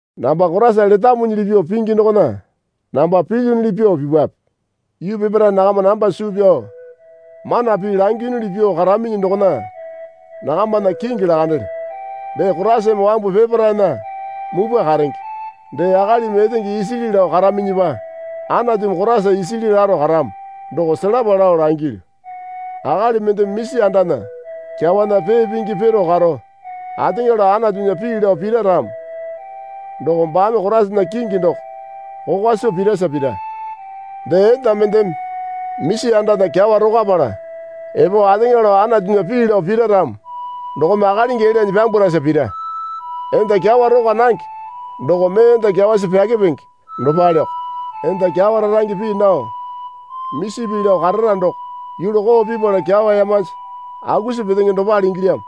Namba Koraisa letamuli pyuo pingi dokona namba pilyunuli pyuo pipwape. Yuu peparae nakama namba suu pyao mana pii langiyunuli pyuo karaminyi dokona nakamana kingi lakandelyo. Dee Koraisame wambu peparaena mupwa karenge. Dee akalimi etenge isili lao karaminyipa Anatumi Koraisa isili laro karamo doko selapa lao langilyu. Akali mendeme misi andana kyawana pee pingi piru karo ateŋa lao Anatunya pii lao pira ramo doko baame Koraisana kingi doko kokwa soo pirasa pira. Dee enda mendeme misi andana kyawa rokwapala epo ateŋa lao Anatunya pii lao pira ramo dokome akalingi elyanyi pyambwarasa pira. Enda kyawa rokwa nange doko mee enda kyawasi pyakepingi dopaleoko. Enda kyawa rarange pii nao misi pii lao karara doko yulu koo pipala kyawa yamanji akusi petenge dopale ingilyamo.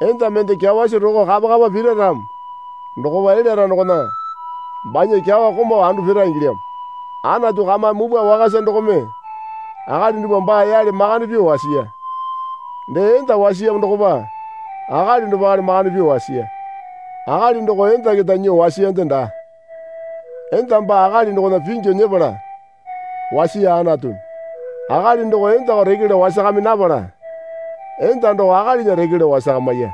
Enda mende kyawasi roko kapa kapa pira ramo dokopa elyara dokona banya kyawa komau andu pira ingilyamo. Anatu kamame mupwa wakasa dokome akali dupwa baa yale makande pyuo wasiya. Dee enda wasiyamo dokopa akali dopale makande pyuo wasiya. Akali doko enda keta nyuo wasiyande daa. Enda baa akali dokona pingyu nyepala wasiya Anatumi. Akali doko endako reke lao wasakami napala enda doko akalinya reke lao wasakamiya.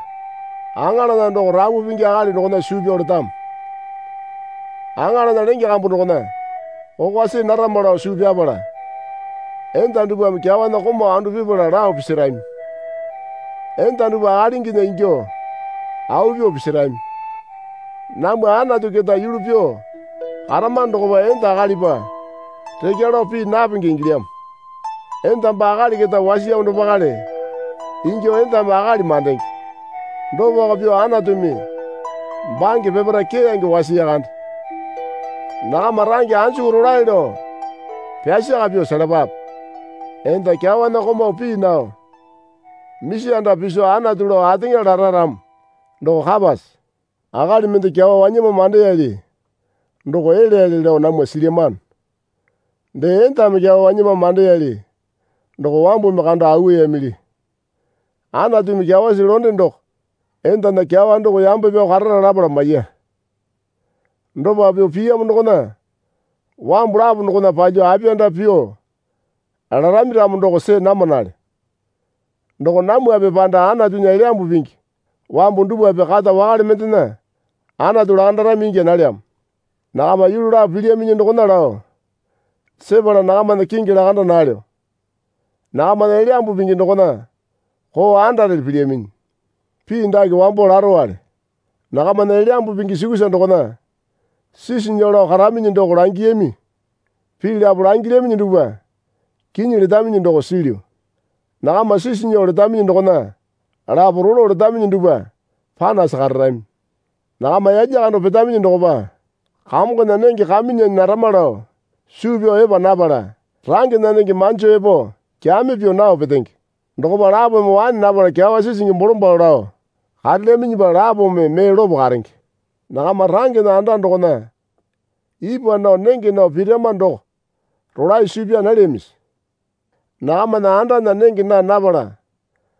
Aŋalana doko rapu pingi akali dokona suu pyao letamo. Aŋalana lenge kambu dokona kokwa see narama lao suu pyapala, enda dupwame kyawana komau andu pipala lao pisirami. Enda dupwa akalinginya ingyuo au pyuo pisirami. Namwa Anatu keta yulu pyuo karamano dokopa enda akalipa rekya lao pii napenge ingilyamo. Enda baa akali keta wasiyamo dopakale ingyuo endame akali mandenge. Dopako pyuo Anatumi bange peparae keyange wasiya kande. Nakama range anjuku rolae lao pyasaka pyuo selapape. Enda kyawana komau pii nao misi anda piso Anatu lao ateŋa lara ramo doko kapase? Akali mende kyawa wanyama mandeyali doko elyayali lao namwa silyamano. Dee endame kyawa wanyama mandeyali doko wambumi kando auwayamili. Anatumi kyawasi londe doko endana kyawa doko yambe pyao karara lapala maiya. Dopa pyuo piyamo dokona wambu lapo dokona palyuo apiyanda pyuo larami ramo doko see namanale. Doko namwape panda Anatunya Elyambu Pingi wambu dupwape kata wakale mendena Anatu lakandarami ingya nalyamo. Nakama yulu lapo pilyaminyi dokona lao sepala nakamana kingi lakanda nalyo. Nakamana Elyambu Pingi dokona koo andarele pilyaminyi. Pii dake wambo larowale. Nakamana Elyambu Pingi sukusa dokona sisi nyuo lao karaminyi doko langiyami. Pii lapo langilyaminyi dupwa kinyi letaminyi doko silyu. (Nakama sisi nyuo letaminyi dokona lapo rolo letaminyi dupwa panasi kararami.) Nakama yalya kando petaminyi dokopa Kamongona nenge Kamyunyane narama lao suu pyao epa napala rangena nenge manjo epo kyami pyuo nao petenge. Dokopa lapome waene napala kyawa sisingi bolombalo lao karelyaminyipa lapome mee lopo karenge. Nakama rangena anda dokona ipwa nao nenge nao pirama doko rolae suu pyaa nalyamisi? Nakamana andana nenge naa napala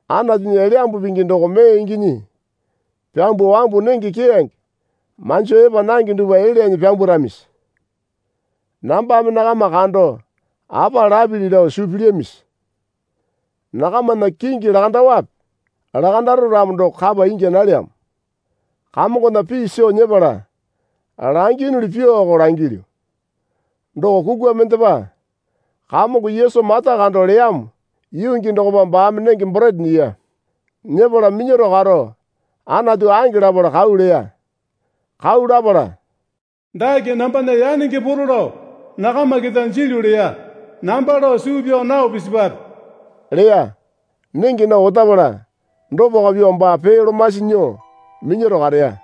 Anatunya Elyambu Pingi doko mee inginyi pyambuo wambu nenge keyange manjo epa nange dupwa elyanyi pyambwaramisi? Nambame nakama kando apa lapili lao suu pilyamisi? Nakamana kingi lakandaowape? Lakandaro ramo doko kapa ingya nalyamo. Kamongona pii soo nyepala langiyunili pyuoko langilyu. Doko kukwa mendepa Kamongo Yesu mata kando leyamo yuu gii dokopa baame nenge borete nyiya. Nyepala minyaro karo Anatu ange lapala kau leya. Kau lapala, Dake nambana yanenge poro lao nakama keta jilyu leya. Namba lao suu pyao nao pisipwape leya. Nenge nao otapala dopako pyuo, baa pee lomasi nyuo minyaro kareya.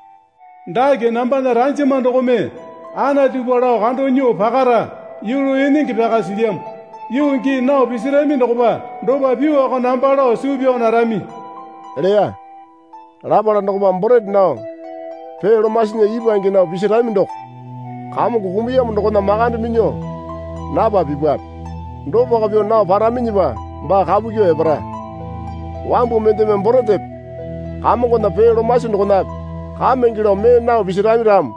Dake nambana ranjama dokome Anatupa lao kando nyuo pakara yulu enenge pyaka silyamo. Yuu gii nao pisirami dokopa dopa pyuoko namba lao suu pyao narami leya. Lapala dokopa borete nao pee lomasinya ipwange nao pisirami doko Kamongo kumuyamo dokona makande minyuo napa pipwape. Dopako pyuo nao paraminyipa baa kapu kyuo epara. Wambu mendeme boretepe Kamongona pee lomasi dokonape kamenge lao mee nao pisirami ramo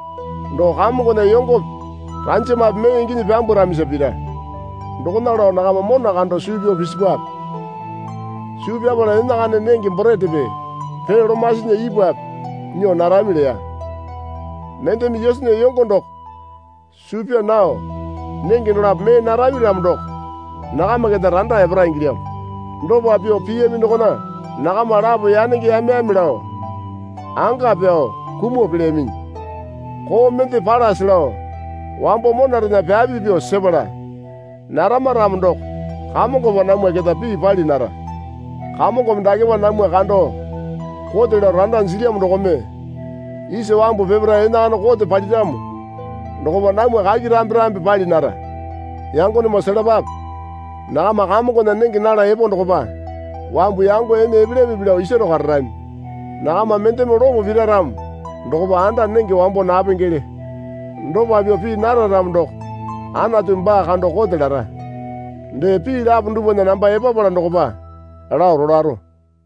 doko Kamongona yongope ranjamape mee inginyi pyambwaramisa pira. Dokona lao nakama mona kando suu pyao pisipwape. Suu pyapala enakana nenge boretepe pee lomasinya ipwape nyuo narami leya. Mendeme Yesunya yongo doko suu pyaa nao nenge dolapo mee narami ramo doko nakama keta randa epara ingilyamo. Dopa pyuo piyami dokona nakama lapo yanenge yame yame lao, anga pyao, kumuo pelyaminyi. Koo mende palase lao wambo monarena pyapi pyuo sepala narama ramo doko Kamongopa namwa keta pii pali nara. Kamongome dakepa namwa kando kote lao randa jilyamo dokome isa wambu peparae enakana kote paliramo dokopa namwa kaki rambi rambi pali nara. Yangonemoo selapape. Nakama Kamongona nenge nala epo dokopa wambu yango ene epelyamipi lao isaro kararami. Nakama mendeme lopo pira ramo dokopa anda nenge wambo napengele. Dopa pyuo pii nara ramo doko Anatumi baa kando kote lara. Dee pii lapo dupwana namba epapala dokopa lao rolaro.